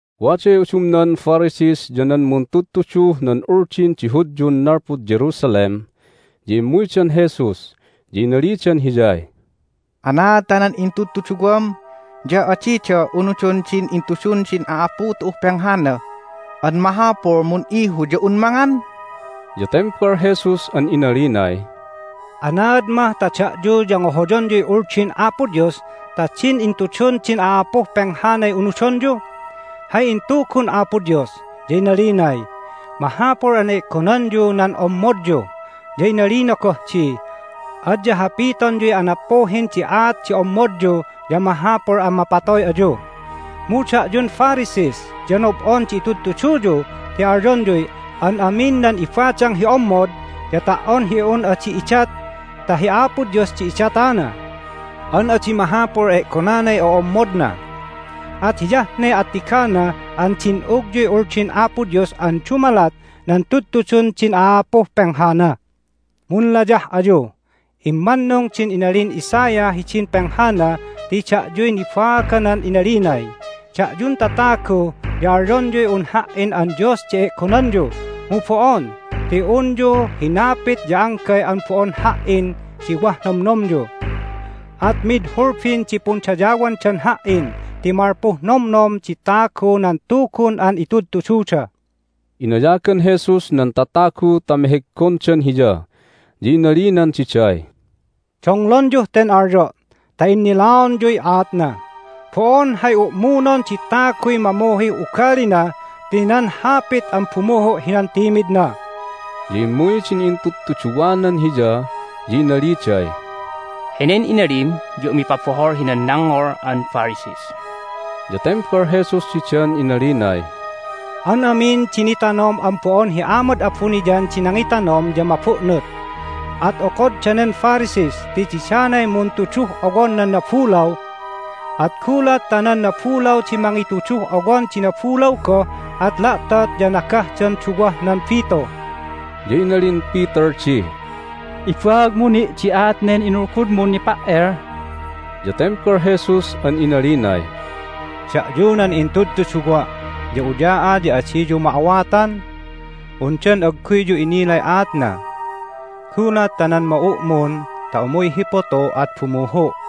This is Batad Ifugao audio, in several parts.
Waday udumnan Pharisees ya nan muntudtuduh nan Uldin di Hudyun nalpud Jerusalem, ya immuydan Jesus, ya inalidan Hiyay, "Anaad ta nan intudtuduwam ya adida unudon din intudun din a'apu tu'uh penghana an mahapul mun'ihu ya un mangan?" Ya tembal Jesus an inalinay, "Anaad mah ta da'yu ya ngohoyonyuy Uldin Apo Dios ta din intudun din a'apuh penghanay unudonyu? Hay intugun Apo Dios, ya inalinay, Mahapul an e'gonanyu nan ommodyu." Ya inalina goh di, "Adya hapitonyuy anappuhin di aat di ommodyu ya mahapul an mapatoy ayu. Mu da'yun Pharisees ya nob'on di itudtuduyu ti alyonyuy, An amin nan ibadang hi ommod ya ta"on hi un adi idat ta hi Apo Dios di idatana an adi mahapul e'gonanay o'ommodna. At hiyah ne attigana an din'ugyuy Uldin Apo Dios an dumalat nan tudtudun din a'apuh penghana. Munlayah ayu! Immannung din inalin Isaiah hidin penghana ti da'yuy nibaaganan inalinay, Da'yun tatagu ya alyonyuy un Ha"in an Dios di e'gonanyu, mu bo'on ti unyu hinapit ya anggay an bo'on Ha"in di wah nomnomyu. At mid hulbin di pundayawandan Ha"in ti malpuh nomnom di tagu nan tugun an itudtududa." Inayagan Jesus nan tatagu ta meheggondan Hiya, ya inalinan diday, "Donglonyuh ten alyo' ta innilaonyuy aatna! Bo'on hay u'munon di taguy mamuhih ugalina ti nan hapit an bumuhu' hinan timidna." Ya immuy din intudtuduwanan Hiya, ya inaliday, "Henen inalim ya umipabohol hinan nangngol an Pharisees!" Ya tembal Jesus didan inalinay, "An amin di nitanom an bo'on hi Amad abuniyan di nangitanom ya mabu'nut. At okod danen Pharisees ti didanay muntuduh owon nan nabulaw! At gulat ta nan nabulaw di mangituduh owon di nabulaw goh at la'tot ya nagahdan duwah nan bitu." Ya inalin Peter di, "Ibaagmu ni' di aat nen inulgudmun nipa"el." Ya tembal Jesus an inalinay, "Da'yu nan intudtuduwa' ya uya'a ya adiyu ma'awatan! Undan agguyyu innilay aatna? Gulat ta nan ma'u'mun ta umuy hi putu at bumuhu'.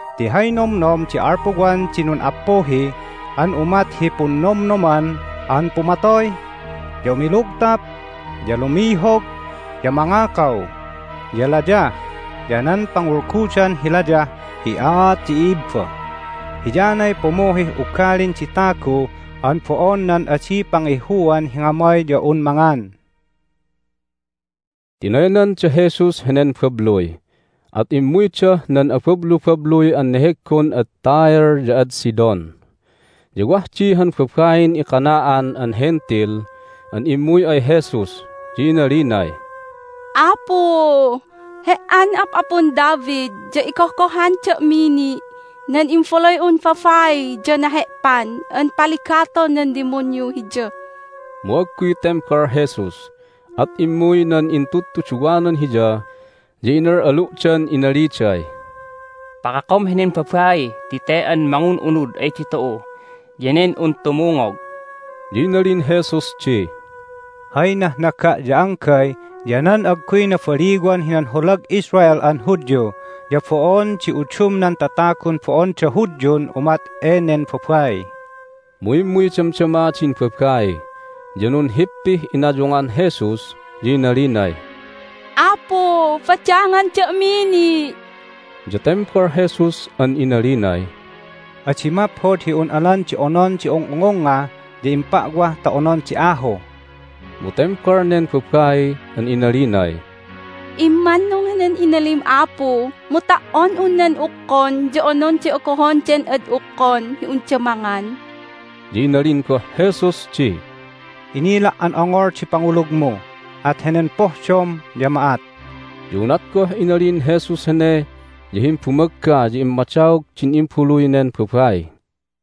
Ti hay nomnom di alpuwan di nun'appuhi an umat hi punnomnoman an pumatoy, ya umilugtap, ya lumihog, ya mangakaw, ya layah, ya nan pangulgudan hi layah hi aat di i'ibba. Hiyanay pumuhih ugalin di tagu an bo'on nan adi pangihuan hi ngamay ya un mangan." Tinaynan da Jesus henen babluy, at immuydah nan abablubabluy an neheggon ad Tyre ya ad Sidon. Ya wah di han babain iCanaan an Hentil an immuy ay Jesus, ya inalinay, "Apu, He"an Ap'apun David, ya igohgohan da'mi ni'! Nan imbaluy'un babai ya nahe'pan an paligaton nan dimunyu hiya!" Mu agguy tembal Jesus. At immuy nan intudtuduwanan Hiya, ya inal'alu'dan inaliday, "Pakakom henen babai ti te an mangun'unud ay ditu'u, ya nen un tumungog!" Ya inalin Jesus di, "Hay nahnaga' ya anggay ya nan agguy nabaliwan hinan holag Israel an Hudyu, ya bo'on di udumnan tatagun bo'onda Hudyun umat enen babai." Mu immuy damdama din babai, ya nunhippih inayungan Jesus, ya inalinay, "Apu, badangan da'mi ni'!" Ya tembal Jesus an inalinay, "Adi maphod hi un alan di onon di ung'ungungnga ya impa'wah ta onon di ahu." Mu tembal nen babai an inalinay, "Immannung henen inalim, Apu, mu ta"on un nan ukkon ya ononday ogohon den ad ukkon hi unda mangan." Ya inalin goh Jesus di, "Inila' an ongol di pangulugmu! At henen pohdom ya ma'at." Ya unat goh inalin Jesus hene ya himbumagga ya immadaog din imbaluy nen babai.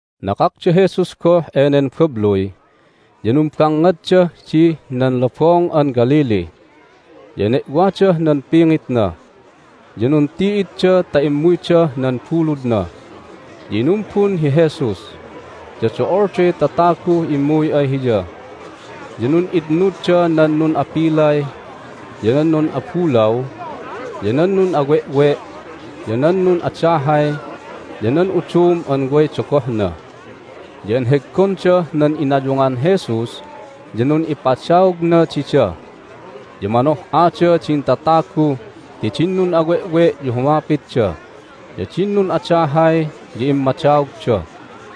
Nakak da Jesus goh enen babluy, ya numbangngaddah dih nan Lobong an Galilee. Ya ene'wadah nan pingitna, ya nunti'idda ta immuydah nan buludna, ya inumbun hi Jesus. Ya do'olday tataguh immuy ay Hiya, ya nun'itnudda nan nun'apilay, ya nan nun'abulaw, ya nan nun'awe'we', ya nan nun'adahay, ya nan udum an way dogohna. Ya enheggondah nan inayungan Jesus, ya nun'ipa'adaogna dida. Ya manoh'ada din tatagu ti din nun'awe'we' ya humapitda, ya din nun'adahay ya immadaogda,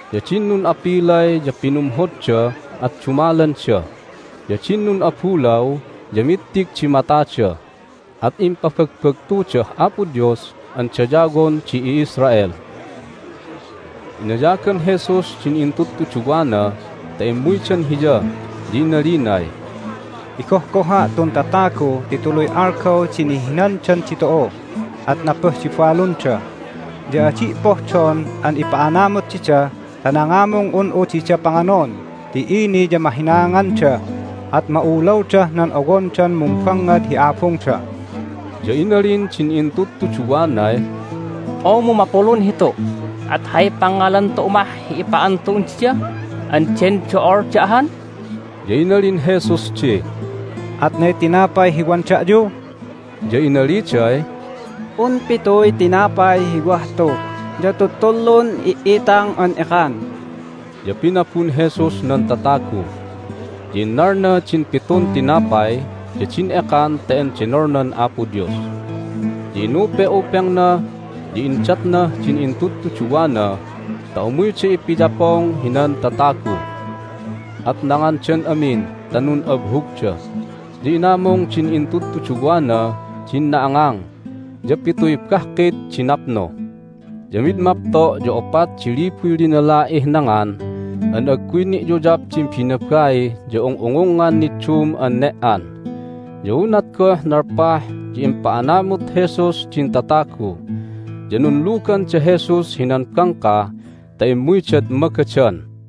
ya din nun'apilay ya pinumhodda at dumalanda, ya din nun'abulaw ya mittig di matada, at impabagbagtudah Apo Dios an dayawon di i'Israel. Inayagan Jesus din intudtuduwana ta immuydan Hiya, ya inalinay, "Igohgoha' tun tatagu ti tuluy algaw di ni'hinandan ditu'u, at napuh di balunda. Ya adi' pohdon an ipa'anamut dida ta nangamung un'u dida panganon ti ini ya mahinaanganda, at ma'ulawdah nan owondan mumbangngad hi abungda." Ya inalin din intudtuduwanay, "Oo, mu mapulun hitu, at hay pangngalan tu'u mah hi ipa'an tu'un dida an den do'olda ahan?" Ya inalin Jesus di, "Atnay tinapay hi wan da'yu?" Ya inaliday, "Un pituy tinapay hi wah tu, ya tuttulun i"itang an ekan." Ya pinabun Jesus nan tatagu, ya innalna din pitun tinapay ya din ekan ta endenolnan Apo Dios, ya inupe'upengna, ya indatnah din intudtuduwana ta umuyda ipiyapong hinan tatagu. At nangandan amin ta nun'abhugda. Ya inamung din intudtuduwana din na'angang, ya pituy bahkit di napnu. Ya mid mapto' ya opat di libuy linala'ih nangan an agguy ni'yuyap din binabai ya ung'ungungngan niddum an ne"an. Ya unat goh nalpah ya impa'anamut Jesus din tatagu. Ya nunlugan da Jesus hinan bangka ta immuydad Magadan.